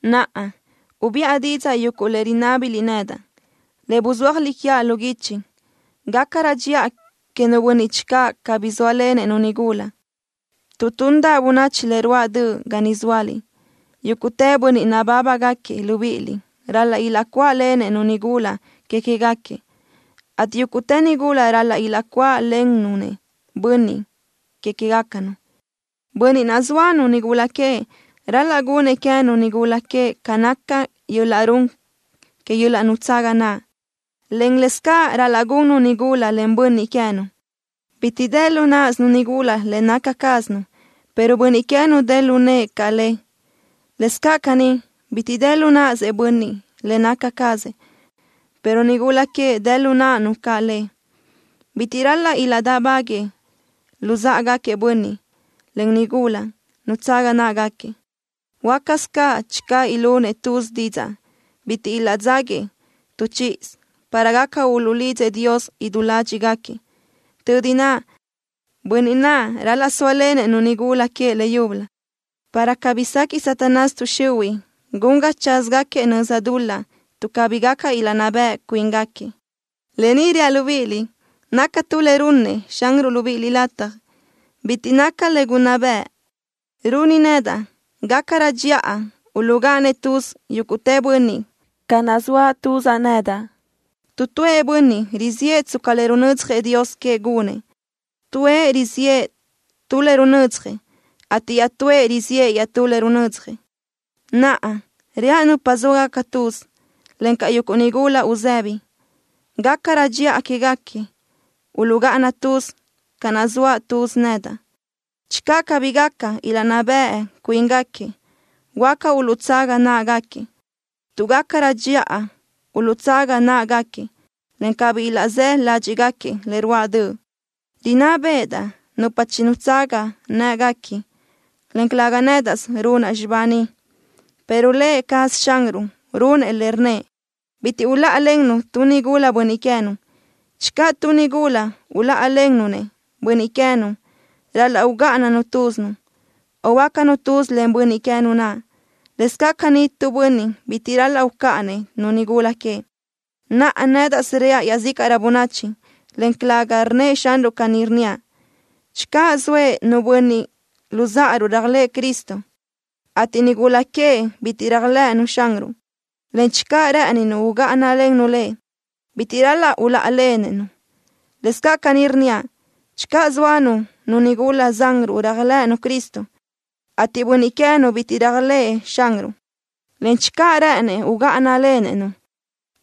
Naʼa, ubiʼa didzaʼ yuguʼ le rinábiliʼ nedaʼ, le buzúajliʼ quiaʼ lu guichi. Gácarö dxiʼa queëʼ nu bönniʼ channö cabí sóalenëʼ-nu nigula. Tuʼ tundaʼ bönachi le ruáʼ döʼ ga niʼ zóaliʼ, yúguʼtë bönniʼ nabábagaquiëʼ libíʼiliʼ ral-laʼ ilaʼcuáʼlenëʼ-nu nigula que queë́gaquiëʼ, ateʼ yúguʼtë nigula ral-laʼ ilaʼcuáʼlennu-nëʼ bönniʼ que queë́gacanu. Bönniʼ naʼ zóanu nigula queëʼ ral-laʼ gunëʼ queë́nu nigula queëʼ ca naca yöl-laʼ run que yöl-laʼ nutsaga naʼ, en laʼ lë́bisö ral-laʼ gunnu nigula len bönniʼ queë́nu. Bitiʼ dë lu náʼasönu nigula le naca cázanu, pero bönniʼ queë́nu dë lu nëʼë caʼ le. Lëscaʼ caní, bitiʼ dë lu náʼasëʼ bönniʼ le naca cazëʼ, pero nigula queëʼ dë lu náʼanu caʼ le. Bitiʼ ral-laʼ ilaʼdáʼbaguëʼë luzáʼagaquiëʼ bönniʼ, en nigula naʼ, nutsaga náʼagaquiëʼ. Huácasö caʼ channö ilunëʼ tuz didzaʼ bitiʼ ilaʼdzáguiëʼ tu chíʼisö para gaca uluʼlidzëʼ Dios idú ládxiʼgaquiëʼ. Tödi naʼ, bönniʼ naʼ ral-laʼ sóalenëʼ-nu nigula queëʼ leyúbölö, para cabí sequiʼ Satanás tuʼ xihuiʼ gun ga tsázagaquiëʼ nöza dul-laʼ tuʼ cabí gaca ilaʼnná beʼe cuíngaquiëʼ. Lë ni reaʼ libíʼiliʼ naca tu le runnëʼ Xanruʼ libíʼiliʼ lataj. Bitiʼ naca le gunná bëʼë. Runi nedaʼ gácarö dxiʼa uluʼgáʼanëʼ tuz yúguʼtë bönniʼ, ca naʼ zoaʼ tuzaʼ nedaʼ. Tu tuëʼ bönniʼ riziʼë tsca le runödzjëʼ Dios queëʼ gunëʼ. Tuëʼ riziʼë tu le runödzjëʼ, ateʼ iaʼtúëʼ riziʼë iaʼtú le runödzjëʼ. Naʼa, reaʼ nupa zóagaca tuz, encaʼ yuguʼ nigula uzëbi, gácarö dxiʼa quéguequi uluʼgáʼana tuz ca naʼ zoaʼ tuz nedaʼ. Channö cabí gaca ilaʼnná beʼe cuíngaquiëʼ, huáca uluʼtsaga náʼagaquiëʼ, tuʼ gácarö dxiʼa uluʼtsaga náʼagaquiëʼ, en cabí ilaʼzë́ ládxiʼgaquiëʼ le ruáʼ döʼ. Rinná béʼedaʼ nupa chinutsaga në́ʼeguequi, en calëga nédaʼsö runaʼ xibá ni, pero Lë cazëʼ Xanruʼ runëʼ le, rnnëʼ: “Bitiʼ uláʼalennu tu nigula bönniʼ queë́nu.” Channö nu nigula uláʼalennu-nëʼ bönniʼ queë́nu, ral-laʼ ugáʼananu túzinu, o huöácanu tuz len bönniʼ queë́nu naʼ. Lëscaʼ caní tu bönniʼ bitiʼ ral-laʼ ucáʼanëʼ-nu nigula queëʼ. Naʼa, nédaʼsö reaʼ iaʼzícaʼrö bönachi, en calëga rnnëʼ Xanruʼ caní, rnníaʼ: Channö zoëʼ nu böchiʼ luzáʼaruʼ réajlëʼë Cristo, ateʼ nigula queëʼ bitiʼ réajlëʼënu Xanruʼ, en channö rë́ʼëninu ugáʼanalennu lëʼ, bitiʼ ral-laʼ uláʼalenëʼ-nu. Lëscaʼ caní rnníaʼ: Channö zóanu nu nigula zanruʼ réajlëʼënu Cristo, ateʼ bönniʼ queë́nu bitiʼ réajlëʼë Xanruʼ, en channö rë́ʼënnëʼ ugáʼanalenëʼ-nu,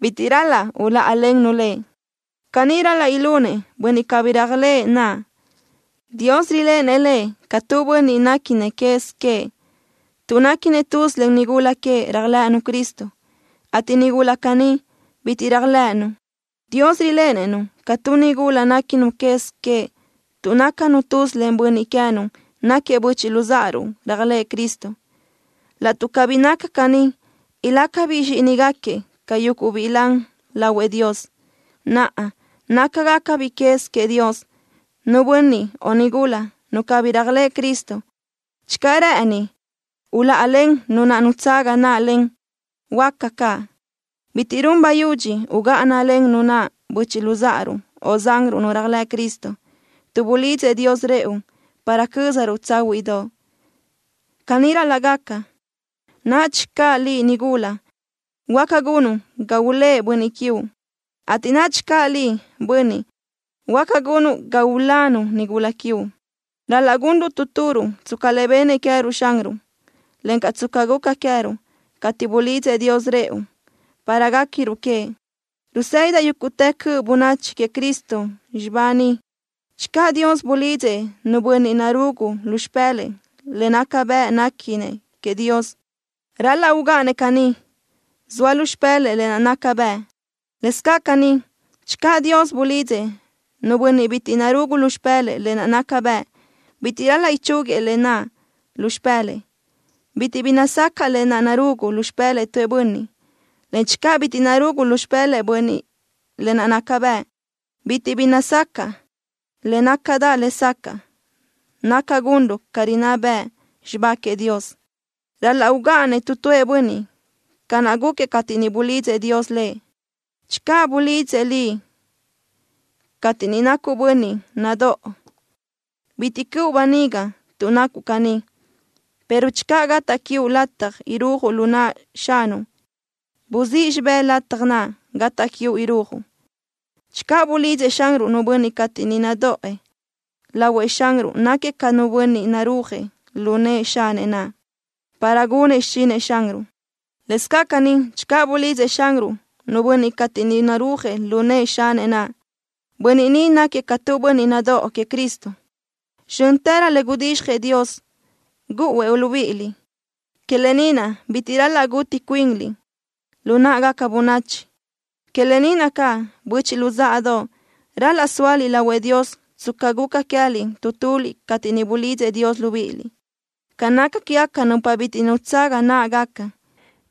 bitiʼ ral-laʼ uláʼalennu lëʼ. ¡Caní ral-laʼ ilunëʼ! Bönniʼ cabí réajlëʼë naʼ, Dios riléʼenëʼ lëʼ ca tu bönniʼ néquinëʼ quez queëʼ tuʼ náquiëʼ tuz len nigula queëʼ réajlëʼënu Cristo, ateʼ nigula caní, bitiʼ réajlëʼënu, Dios riléʼenëʼ-nu ca tu nigula néquinu quez queëʼ tuʼ nácanu tuz len bönniʼ queë́nu náquiëʼ böchiʼ luzáʼaruʼ réajlëʼë Cristo. Laʼtuʼ cabí naca caní, ilácabiʼ zxíʼinigaquiëʼ ca yuguʼ biʼi lan lahuëʼ Dios. Naʼa, nácagacabiʼ quez queëʼ Dios. Nu bönniʼ o nigula nu cabí réajlëʼ Cristo, channö rë́ʼëni uláʼalen nu naʼ nutsaga náʼalen, huáca caʼ. Bitiʼ run bayudxi ugáʼanalen nu naʼ böchiʼ luzáʼaruʼ o zanruʼ nu réajlëʼ Cristo, tuʼ bulidzëʼ Dios rëʼu para cö́zaruʼ tsáhuiʼdoʼ. ¡Caní ral-laʼ gaca! Nadxi caʼ liʼ, nigula, huáca gunuʼ ga ulë́ʼ bönniʼ quiuʼ, ateʼ nadxi caʼ liʼ, bönniʼ, huáca gunuʼ ga ulanu nigula quiuʼ. Ral-laʼ gunruʼ tu turuʼ tsca le bennëʼ queë́ruʼ Xanruʼ, encaʼ tsca guca queë́ruʼ cateʼ bulidzëʼ Dios rëʼu para guéquiruʼ queëʼ. Rusë́didaʼ yúguʼtë cöʼ bönachi queëʼ Cristo xibá ni. Channö Dios bulidzëʼ nu bönniʼ narugu lu xipë́lëʼë le naca bëʼ néquinëʼ queëʼ Dios, ral-laʼ ugáʼanëʼ caní, zoa lu xipë́lëʼë lë naʼ naca bëʼ. Lëscaʼ caní, channö Dios bulidzëʼ nu bönniʼ bitiʼ narugu lu xipë́lëʼë lë naʼ naca bëʼ, bitiʼ ral-laʼ ichúguiëʼ lë naʼ lu xipë́lëʼë. Bitiʼ bi nazacaʼ lë naʼ narugu lu xipë́lëʼë tu bönniʼ, en channö bitiʼ narugu lu xipë́lëʼë bönniʼ lë naʼ naca bëʼ, bitiʼ bi nazacaʼ. Le nácadaʼ lesacaʼ naca gunruʼ ca rinná bëʼ xibá queëʼ Dios. Ral-laʼ ugáʼanëʼ tu tuëʼ bönniʼ ca naʼ gúquiëʼ cateʼ niʼ bulidzëʼ Dios lëʼ. Channö bulidzëʼ liʼ cateʼ niʼ nacuʼ bönniʼ nadóʼo, bitiʼ cöʼu böniga tuʼ nacuʼ caní, pero channö gataʼ quiuʼ lataj irujuʼ lu naʼ xanuʼ, buzíʼ xibé lataj naʼ gataʼ quiuʼ irujuʼ. Channö bulidzëʼ Xanruʼ nu bönniʼ cateʼ niʼ nadoʼë, lahuëʼ Xanruʼ náquiëʼ ca nu bönniʼ narúajëʼ lu nëʼë xanëʼ naʼ, para gunëʼ xichinëʼ Xanruʼ. Lëscaʼ caní, channö bulidzëʼ Xanruʼ nu bönniʼ cateʼ niʼ narúajëʼ lu nëʼë xanëʼ naʼ, bönniʼ ni náquiëʼ ca tu bönniʼ nadóʼo queëʼ Cristo. Zxö́ntërö le gudizxjëʼ Dios, gúʼuëʼ libíʼiliʼ. Que lë ni naʼ bitiʼ ral-laʼ gutiʼ cuinliʼ lu náʼagaca bönachi. Que lë ni naʼ caʼ, böchiʼ luzáʼadoʼ, ral-laʼ sóaliʼ lahuëʼ Dios tsca guca queë́liʼ tu tuliʼ cateʼ niʼ bulidzëʼ Dios libíʼiliʼ. Ca naca quégaca nupa bitiʼ nutsaga náʼagaca,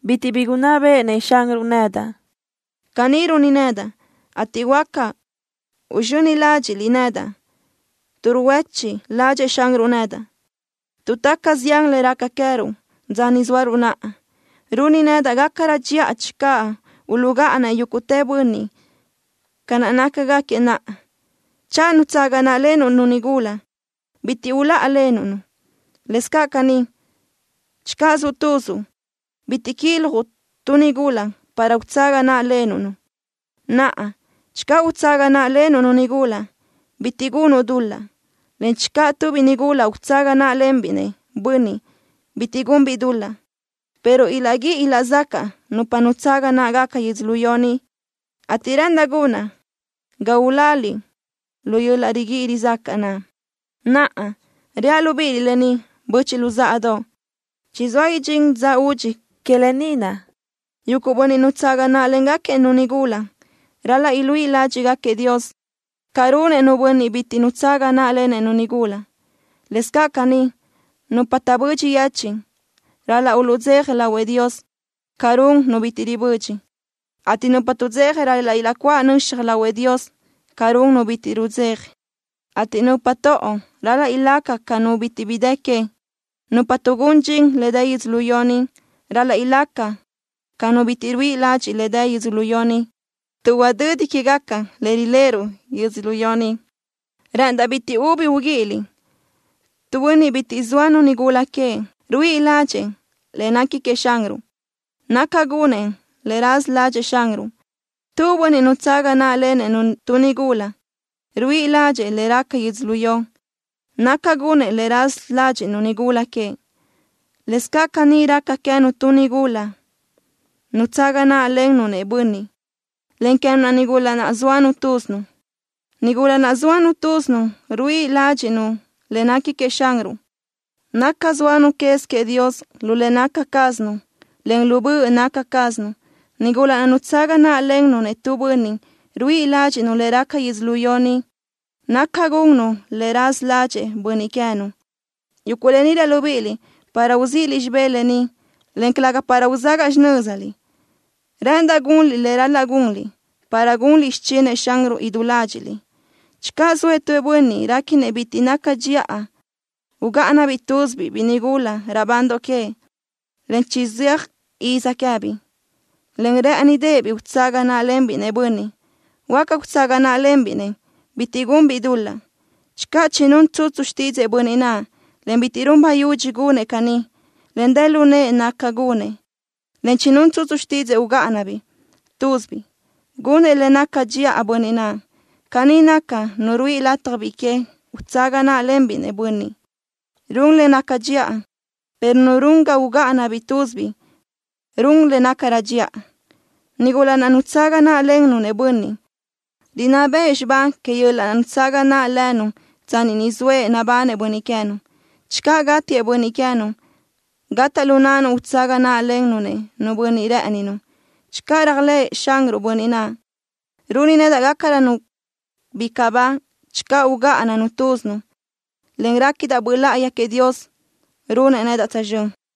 bitiʼ bi gunná béʼenëʼ Xanruʼ nedaʼ. Caní runi nedaʼ, ateʼ huáca uzxöni ládxiʼliʼ nedaʼ tuʼ ruhuéchiʼ ládxëʼë Xanruʼ nedaʼ. Tuʼ taca zián le raca queë́ruʼ dza ni zóaruʼ naʼa, runi nedaʼ gácarö dxiʼa channö uluʼgáʼanëʼ yúguʼtë bönniʼ ca nácagaquiëʼ naʼa. Channö nutsaga náʼlenuʼ-nu nigula, bitiʼ uláʼalenuʼ-nu. Lëscaʼ caní, channö zuʼ tuzuʼ, bitiʼ quiljuʼ tu nigula para utsaga náʼlenuʼ-nu. Naʼa, channö utsaga náʼlenuʼ-nu nigula, bitiʼ gunuʼ dul-laʼ, en channö tu biʼi nigula utsaga náʼalenbiʼ-nëʼ bönniʼ, bitiʼ gunbiʼ dul-laʼ, pero ilaʼguíʼi ilaʼzacaʼ nupa nutsaga náʼagaca yödzölió ni, ateʼ rë́ʼëndaʼ gunaʼ ga uláliʼ lu yöl-laʼ riguíʼi rizacaʼ naʼ. Naʼa, reaʼ libíʼiliʼ lë ni, böchiʼ luzáʼadoʼ. ¡Chizóa idxín dza údxi! Que lë ni naʼ, yuguʼ bönniʼ nutsaga náʼlengaquiëʼ-nu nigula ral-laʼ iluíʼ ládxiʼgaquiëʼ Dios, ca runëʼ nu bönniʼ bitiʼ nutsaga náʼalenëʼ nigula. Lëscaʼ caní, nupa taʼbödxi yechiʼ ral-laʼ uluʼdzeja lahuëʼ Dios ca run nu bitiʼ ribödxi, ateʼ nupa tuʼdzeja ral-laʼ ilaʼcuáʼ nöxaj lahuëʼ Dios ca run nu bitiʼ rudzeja, ateʼ nupa toʼo ral-laʼ ilaca ca nu bitiʼ bi dë que. Nupa tuʼgún dxin le dë yödzölió ni ral-laʼ ilaca ca nu bitiʼ ruíʼi ladxiʼ le dë yödzölió ni, tuʼ udödi quégaca le riléʼeruʼ yödzölió ni. Rë́ʼëndaʼ bitiʼ ubi uguíʼiliʼ. Tu bönniʼ bitiʼ zóanu nigula queëʼ ruíʼi ládxëʼë le nequi queëʼ Xanruʼ, naca gunëʼ le raza ládxëʼë Xanruʼ. Tu bönniʼ nutsaga náʼlenëʼ-nu tu nigula ruíʼi ládxëʼë le raca yödzölió, naca gunëʼ le raza ládxiʼnu nigula queëʼ. Lëscaʼ caní raca queë́nu tu nigula nutsaga náʼlennu-nëʼ bönniʼ, en queë́nu nigula naʼ zóanu túzinu. Nigula naʼ zóanu túzinu ruíʼi ládxiʼnu le nequi queëʼ Xanruʼ, naca sóanu quez queëʼ Dios lu le naca cázanu, en lu böʼ naca cázanu. Nigula naʼ nutsaga náʼlennu-nëʼ tu bönniʼ ruíʼi ládxiʼnu le raca yödzölió ni, naca gunnu le raza ládxëʼë bönniʼ queë́nu. Yuguʼ lë ni reaʼ libíʼiliʼ para uzíʼiliʼ xibé lë ni, en calëga para uzágaʼa xinö́ziliʼ. Rë́ʼëndaʼ gunliʼ le ral-laʼ gunliʼ, para gunliʼ xichinëʼ Xanruʼ idú ládxiʼliʼ. Channö zoëʼ tu bönniʼ réquinëʼ bitiʼ naca dxiʼa ugáʼanabiʼ túzibiʼ biʼi nigula raʼbandoʼ queëʼ, en chizóa iz queë́biʼ, en rë́ʼënideʼebiʼ utsaga náʼalenbiʼ-nëʼ bönniʼ, huáca utsaga náʼalenbiʼ-nëʼ. ¡Bitiʼ gunbiʼ dul-laʼ! Channö chinún tsutsu xtídzëʼë bönniʼ naʼ, en bitiʼ run bayudxi gunëʼ caní, en dë lu nëʼë naca gunëʼ, en chinún tsutsu xtídzëʼë ugáʼanabiʼ túzibiʼ, gunëʼ le naca dxiʼa bönniʼ naʼ. Caní naca, nu ruíʼi lataj biʼi que utsaga náʼalenbiʼ-nëʼ bönniʼ, run le naca dxiʼa, pero nu run ga ugáʼanabiʼ túzibiʼ run le nácarö dxiʼa. Nigula naʼ nutsaga náʼlennu-nëʼ bönniʼ, rinná beʼe xibá que yöl-laʼ nutsaga naʼ lënu tsanni ni zoëʼ nabanëʼ bönniʼ queë́nu. Channö gátiëʼ bönniʼ queë́nu, gataʼ lu náʼanu utsaga náʼlennu-nëʼ nu bönniʼ rë́ʼëninu, channö réajlëʼë Xanruʼ bönniʼ naʼ. Runi nedaʼ gácarönu bicaʼ ba channö ugáʼananu túzinu, en réquidaʼ Böʼ Láʼayi queëʼ Dios runëʼ nedaʼ tzazxö́n.